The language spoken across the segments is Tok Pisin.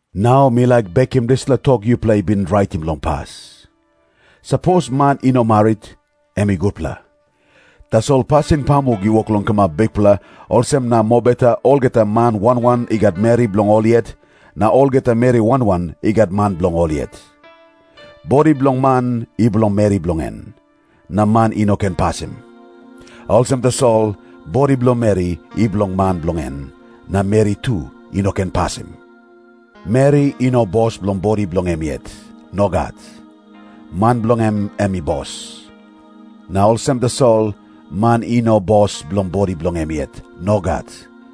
Nau mi laik bekim dispela tok yupela i bin raitim long pas. Sapos man i no marit, em i gutpela. Tasol pasin pamuk i wok long kamap bikpela, olsem na mobeta olgeta man wan wan i gat meri bilong ol yet, na olgeta meri wan wan i gat man bilong ol yet. Bodi bilong man i bilong meri bilong en, na man i no ken pasim. Olsem tasol, bodi bilong meri i bilong man bilong en, na meri tu i no ken pasim. Meri i no bos bilong bodi bilong em yet. Nogat. Man bilong en em i bos. Na olsem tasol, man i no bos bilong bodi bilong em yet. Nogat.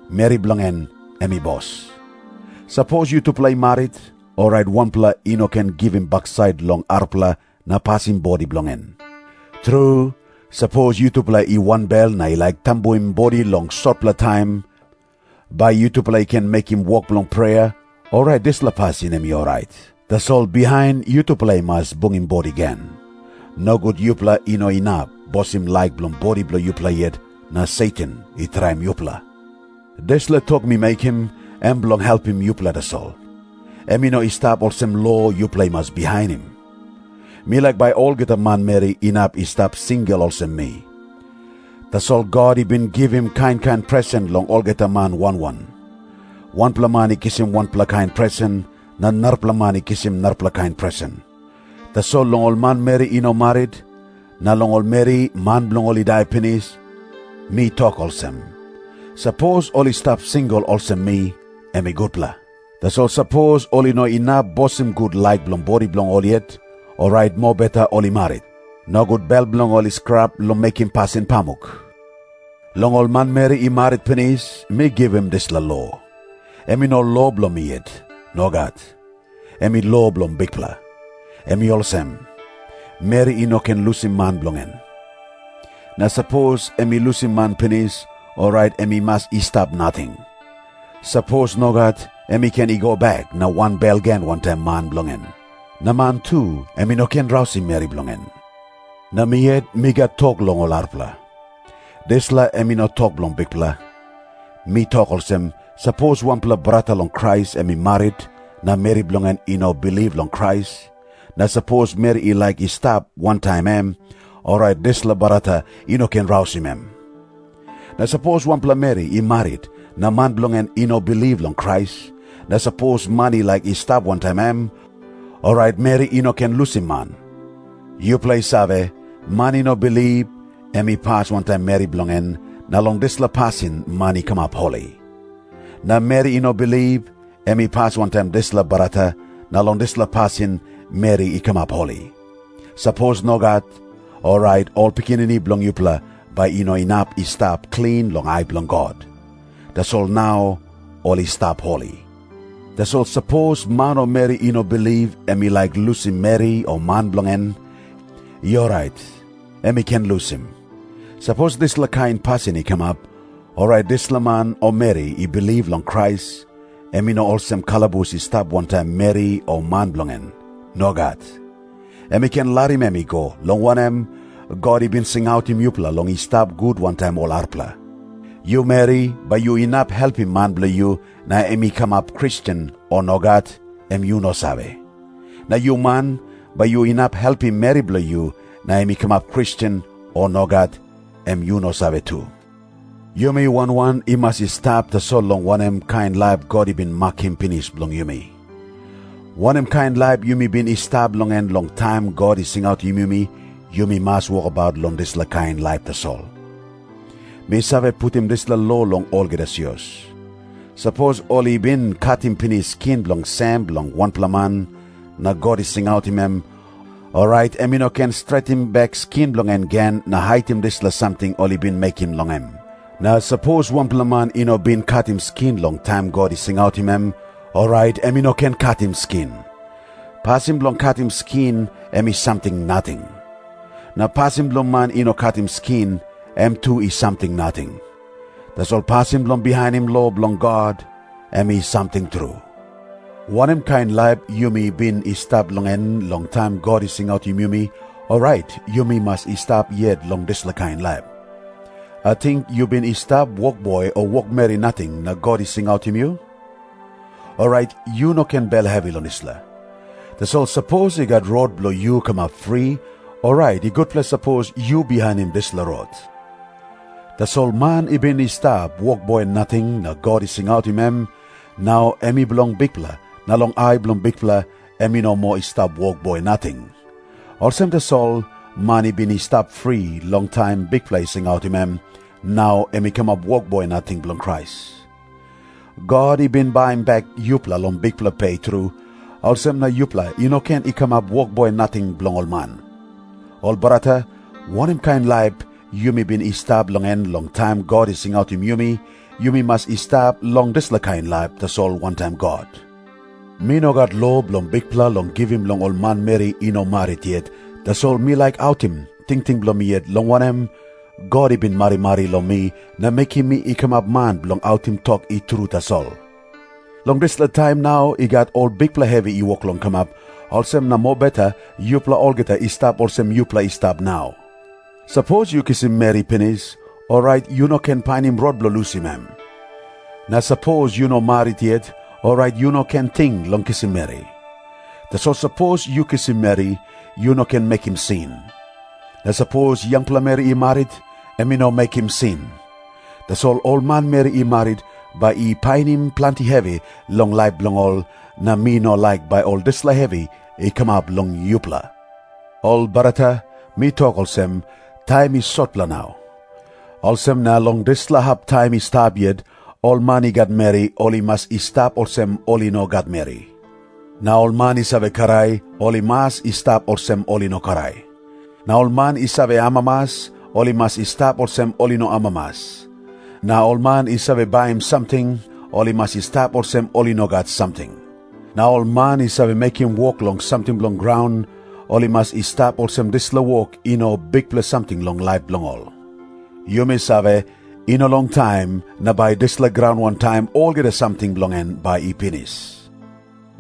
Meri bilong en em i bos. Sapos yutupela i marit, orait wanpela i no ken givim baksait long arapela na pasim bodi bilong en. Tru, sapos yutupela i wanbel na i laik tambuim bodi long sotpela taim, bai yutupela i ken mekim wok bilong prea, orait dispela pasin em i orait. Tasol bihain yutupela i mas bungim bodi gen. Nogut yupela i no inap bosim laik bilong bodi bilong yupela yet, na Satan i traim yupela. Dispela tok mi mekim, em bilong helpim yupela tasol. Em i no i stap olsem lo yupela i mas bihainim. Mi laik bai olgeta manmeri inap i stap singel olsem mi. Tasol God i bin givim kain kain presen long olgeta man wan wan. Wanpela man i kisim wanpela kain presen, na narapela man i kisim narapela kain presen. Tasol long ol manmeri i no marit, na long ol meri man bilong ol i dai pinis, mi tok olsem. Sapos ol i stap singel olsem mi, em i gutpela. Tasol sapos ol i no inap bosim gut laik bilong bodi bilong ol yet, orait mobeta ol i marit. Nogut bel bilong ol i skrap long mekim pasin pamuk. Long ol manmeri i marit pinis, mi givim dispela lo. Em i no lo bilong mi yet. Nogat. Em i lo bilong Bikpela. Em i olsem. Meri i no ken lusim man bilong en. Na sapos em i lusim man pinis, orait em i mas i stap nating. Sapos nogat, em i ken i go bek na wanbel gen wantaim man bilong en. Na man tu em i no ken rausim meri bilong en. Na mi yet mi gat tok long ol arapela. Dispela em i no tok bilong Bikpela. Mi tok olsem, sapos wanpela brata long Krais em i marit na meri bilong en i no bilip long Krais, na sapos meri i laik i stap wantaim em, orait dispela brata i no ken rausim em. Na sapos wanpela meri i marit na man bilong en i no bilip long Krais, na sapos man i laik i stap wantaim em, orait meri i no ken lusim man. Yupela i save, man i no bilip, em i pas wantaim meri bilong en, na long dispela pasin man i kamap holi. Na meri i no bilip, em i pas wantaim dispela brata, na long dispela pasin meri i kamap holi. Sapos nogat, orait ol pikinini bilong yupela bai i no inap i stap klin long ai bilong God. Tasol nau ol i stap holi. Tasol sapos man o meri i no bilip em i laik lusim meri o man bilong en, i orait, em i ken lusim. Sapos dispela kain pasin i kamap, orait dispela man o meri i bilip long Krais, em i no olsem kalabus i stap wantaim meri o man bilong en. Nogat. Em i ken larim em i go, long wanem, God i bin singautim yupela long i stap gut wantaim ol arapela. Yu meri, bai yu inap helpim man bilong yu na em i kamap Kristen, o nogat, em yu no save. Na yu man, bai yu inap helpim meri bilong yu na em i kamap Kristen, o nogat, em yu no save tu. Yumi wan wan i mas i stap tasol long wanem kain laip God i bin makim pinis bilong yumi. Wanem kain laip yumi bin i stap long en long taim God i singautim yumi, yumi mas wokabaut long dispela kain laip tasol. Mi save putim dispela lo long olgeta sios. Sapos ol i bin katim pinis skin bilong sem bilong wanpela man, na God i singautim em, orait em i no ken stretim bek skin bilong en gen na haitim dispela samting ol i bin mekim long em. Na sapos wanpela man i no bin katim skin long taim God i singautim em, orait em i no ken katim skin. Pasin bilong katim skin, em i samting nating. Na pasin bilong man i no katim skin, em tu i samting nating. Tasol pasin bilong bihainim lo bilong God, em i samting tru. Wanem kain laip yumi bin i stap long en long taim God i singautim yumi, orait yumi mas i stap yet long dispela kain laip. Ating yu bin i stap wokboi o wokmeri nating na God i singautim yu? Orait yu no ken bel hevi long dispela. Tasol sapos i gat rot bilong yu kamap fri, orait i gutpela sapos yu bihainim dispela rot. Tasol man i bin i stap wokboi nating na God i singautim em, nau em i bilong Bikpela na long ai bilong Bikpela em i no moa i stap wokboi nating. Olsem tasol, man i bin i stap fri long taim Bikpela i singautim em, nau em i kamap wokboi nating bilong Krais. God i bin baim bek yupela long bikpela pe tru, olsem na yupela i no ken i kamap wokboi nating bilong ol man. Ol brata, wanem kain laip yumi bin i stap long en long taim God i singautim yumi, yumi mas i stap long dispela kain laip tasol wantaim God. Mi no gat lo bilong Bikpela long givim long ol manmeri i no marit yet, tasol mi laik autim tingting bilong mi yet, long wanem, God i bin marimari long mi na mekim mi i kamap man bilong autim tok i tru tasol. Long dispela taim nau i gat ol bikpela hevi i wok long kamap, olsem na mobeta yupela olgeta i stap olsem yupela i stap nau. Sapos yu kisim meri pinis, orait yu no ken painim rot bilong lusim em. Na sapos yu no marit yet, orait yu no ken ting long kisim meri. Tasol sapos yu kisim meri, yu no mekim sin. Na sapos yangpela meri i marit, em i no mekim sin. Tasol ol manmeri i marit bai i painim planti hevi long laip bilong ol, na mi no laik bai ol dispela hevi i kamap long yupela. Ol brata, mi tok olsem, taim i sotpela nau. Olsem na long dispela hap taim i stap yet, ol man i gat meri ol i mas i stap olsem ol i no gat meri. Na ol man i save krai, ol i mas i stap olsem ol i no krai. Na ol man i save amamas, ol i mas i stap olsem ol i no amamas. Na ol man i save baim samting, ol i mas i stap olsem ol i no gat samting. Na ol man i save mekim wok long samting bilong graun, ol i mas i stap olsem dispela wok i no bikpela samting long laip bilong ol. Yumi save, i no longtaim na bai dispela graun wantaim olgeta samting bilong en bai i pinis.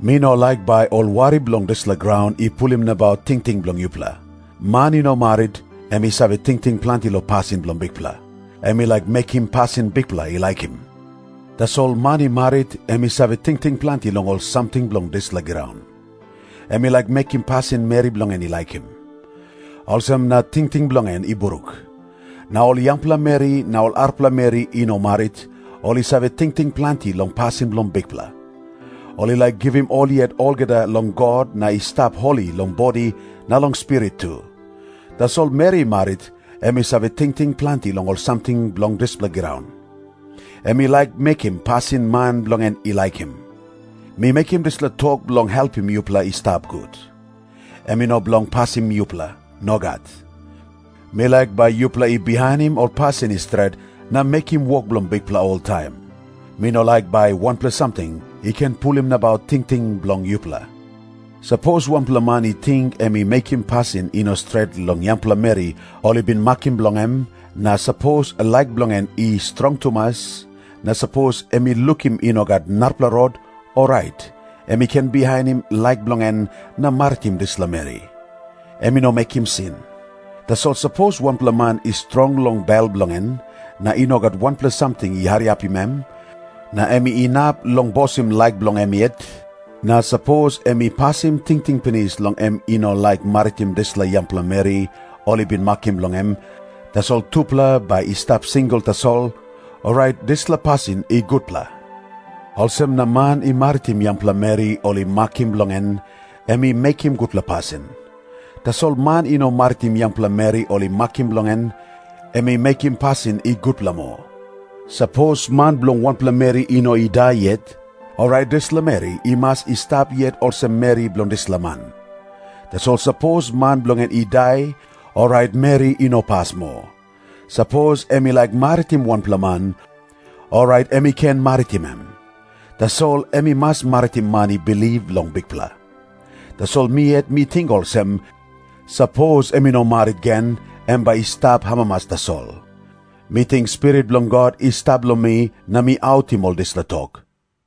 Mi no laik bai ol wari bilong dispela graun i pulim nabaut tingting bilong yupela. Man i no marit, em i save tingting planti long pasin bilong Bikpela. Em i laik mekim pasin Bikpela i laikim. Tasol man i marit, em i save tingting planti long ol samting bilong dispela graun. Em i laik mekim pasin meri bilong en i laikim. Olsem na tingting bilong en i bruk. Na ol yangpela meri na ol arapela meri i no marit, ol i save tingting planti long pasin bilong Bikpela. Ol i laik givim ol yet olgeta long God na i stap holi long bodi na long spirit tu. Tasol meri i marit, em i save tingting planti long ol samting bilong dispela graun. Em i laik mekim pasin man bilong en i laikim. Mi mekim dispela tok bilong helpim yupela i stap gut. Em i no bilong pasim yupela. Nogat. Mi laik bai yupela i bihainim ol pasin i stret na mekim wok bilong Bikpela oltaim. Mi no laik bai wanpela samting i ken pulim nabaut tingting bilong yupela. Sapos wanpela man i ting em i mekim pasin i no stret long yangpela meri ol i bin makim bilong em, na sapos laik bilong en i strong tumas, na sapos em i lukim i no gat narapela rot, orait em i ken bihainim laik bilong en na maritim dispela meri. Em i no mekim sin. Tasol sapos wanpela man i strong long bel bilong en, na i no gat wanpela samting i hariapim em, na em inap long bosim laik bilong em yet, na sapos em i pasim tingting pinis long em i no laik maritim dispela yangpela meri ol i bin makim bilong em, tasol tupela bai i stap singel tasol, orait dispela pasin i gutpela. Olsem na man i maritim yangpela meri ol i makim bilong en, em i mekim gutpela pasin. Tasol man i no maritim yangpela meri ol i makim bilong en, em i mekim pasin i gutpela moa. Sapos man bilong wanpela meri i no i dai yet, orait dispela meri i mas i stap yet olsem meri bilong dispela man. Tasol sapos man bilong en i dai, orait meri i no pas moa. Sapos em i laik maritim wanpela man, orait em i ken maritim em. Tasol em i mas maritim man i bilip long Bikpela. Tasol mi yet mi ting olsem, sapos em i no marit gen, em bai i stap amamas tasol. Mi ting Spirit bilong God i stap long mi, na mi autim ol dispela tok.